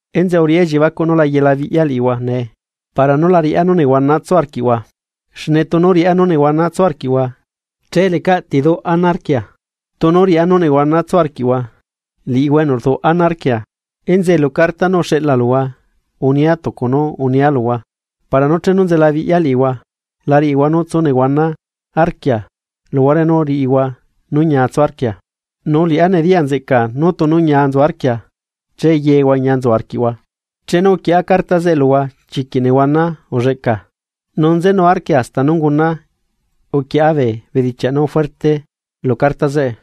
Enzeꞌe uriꞌá elliebacuꞌ, nu la yelabiꞌya liꞌihua nee, para nú la riꞌá nú nehuana tsu arquiꞌhua. Xne tunu riꞌá nú nehuana tsu arquiꞌhua, che ¿lecaꞌ ti duꞌ ana arquia, tunu riꞌá nú nehuana tsu arquiꞌhua liꞌihua enu rduꞌ ana arquia? Enzeꞌe lu carta nú uxeꞌlala luhua unia tucu nú unia luhua, para nú chenu nzelabiꞌya liꞌihua la riꞌihua nú tsu nehuana arquia luhuare nú riꞌihua nú ñia tsu arquia. Nu liꞌá nediya nzeꞌcaa nú tunu ñia nzu arquia che yehua ñia nzu arquiꞌhua. Chenu uquieꞌa carta zeꞌe luhua chiquiꞌ nehuana ulleꞌca nu nzenu arquia hasta nú unguna uquieꞌa bee bedichiaꞌ nú fuerte lu carta zeꞌe,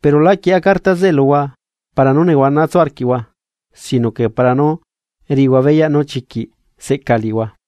pero lá quieꞌa carta zeꞌe luhua para nú nehuana tsu arquiꞌhua sino que para nú riꞌihua beyaꞌ nú chiquiꞌ seꞌca liꞌihua.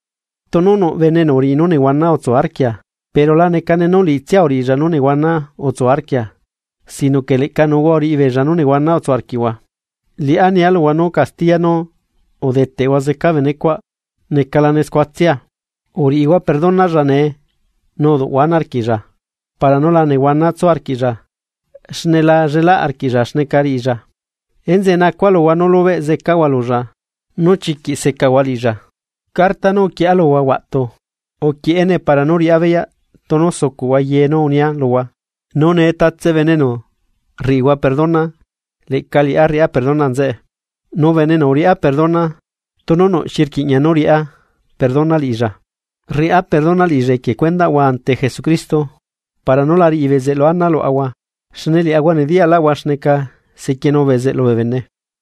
Tunu nuꞌ bene enu uriꞌi nú nehuana utsu arquia pero la necane nú liꞌitsia uriꞌilla nú nehuana utsu arquia sino que leꞌca nuuhua uriꞌi beella nú nehuana utsu arquiꞌhua. Liꞌá nia luhua nú castiya nú udeteꞌhua zeca benecuaꞌ necalane scuatsia. Uriꞌihua perdonalla nee nu uduꞌhua ana arquiꞌlla para nú la nehuana tsu arquiꞌlla xne la llelaꞌ arquiꞌlla xneca riꞌilla. Enzeꞌe nacua luhua nú lubeꞌ zecahua lulla nú chiquiꞌ secahua liꞌilla. Carta nú uquieꞌa luhua huaꞌtu, uquieꞌene para nú riꞌá beyaꞌ tunu sucuꞌhua ye nú unia luhua. Nu nee tatse bene enu rriꞌihua perdona, leꞌca liꞌá rriꞌá perdona nzeꞌe, nu bene enu uriꞌá perdona tunu nuꞌ xi rquiꞌña nú riꞌa perdona liꞌilla, rriꞌá perdona liꞌilla equie cuendaꞌhua ante Jesucristo. Para nú la riꞌi bezeꞌlu ana luaꞌahua, xne liaꞌahua nediyaꞌlaꞌahua xneca sequienu bezeꞌlu bee bene.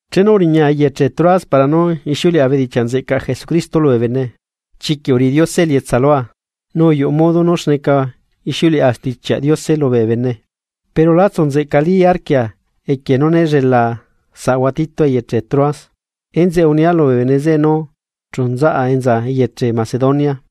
Chenu uriñaa eyeche Troas para nú ixiuleꞌa bedichiaꞌ nzeꞌcaꞌ Jesucristo lubee bene, chiquiꞌ uriꞌi Diose elietsa lua, nu uyuꞌu modo nú xneca ixiuleꞌa Stichiaꞌ Diose lubee bene. Pero lá tsu nzeꞌcali arquia equie nú né llelaa saꞌahua Tito eyeche Troas, enzeꞌe unia lubee bene zeꞌe nu chu nzaꞌa enza eyeche Macedonia.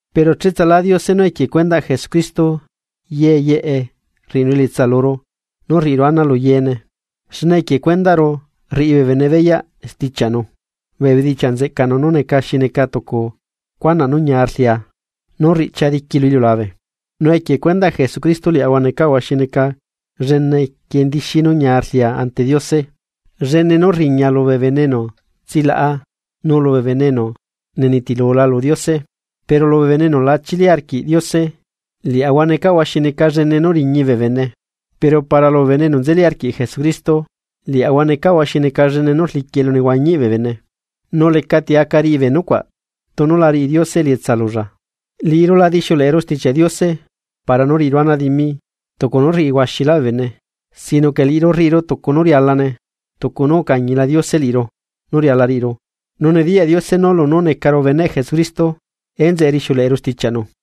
Pero cheꞌtsalá Diose nú equie cuendaꞌ Jesucristo ye yeꞌe rriꞌinu elietsa luru nú rriꞌiru ana lu yeene, xne equie cuendaꞌru rriꞌi bee bene beyaꞌ stichiaꞌnu, bee bedichiaꞌ nzeꞌcaꞌnu nú neca xi neca tucu cuanaꞌ nú ñia rlia nú rriꞌchia diqui lu iliulabe. Nu equie cuendaꞌ Jesucristo liaꞌahua necaꞌahua xi neca llene quiendixi nu ñia rlia ante Diose, llene nú rriña lubee bene enu tsilaꞌa nu lubee bene enu nenitilu lu Diose. Pero lubee bene enu lachili arquiꞌ Diose liaꞌahua necaꞌahua xi neca llene nú riñi bee bene, pero para lubee bene enu nzeli arquiꞌ Jesucristo, liaꞌahua necaꞌahua xi neca llene nú rliquiꞌ elunehuañiꞌ bee bene. Nu lecati aca riꞌi bee nucuaꞌ tunu la riꞌi Diose elietsa lulla. Liꞌiru la dixiuleꞌeru Stichiaꞌ Diose para nú riꞌiru ana dimi tucu nú rriꞌi huaxilá bee bene sino que liꞌiru rriꞌiru tucu nú rialane, tucu nú ucañila Diose liꞌiru nú riala riꞌiru. Nu nediyaꞌ Diose nú lunú necaru beneꞌ Jesucristo enzeꞌe rixiuleꞌeru stichiaꞌnu.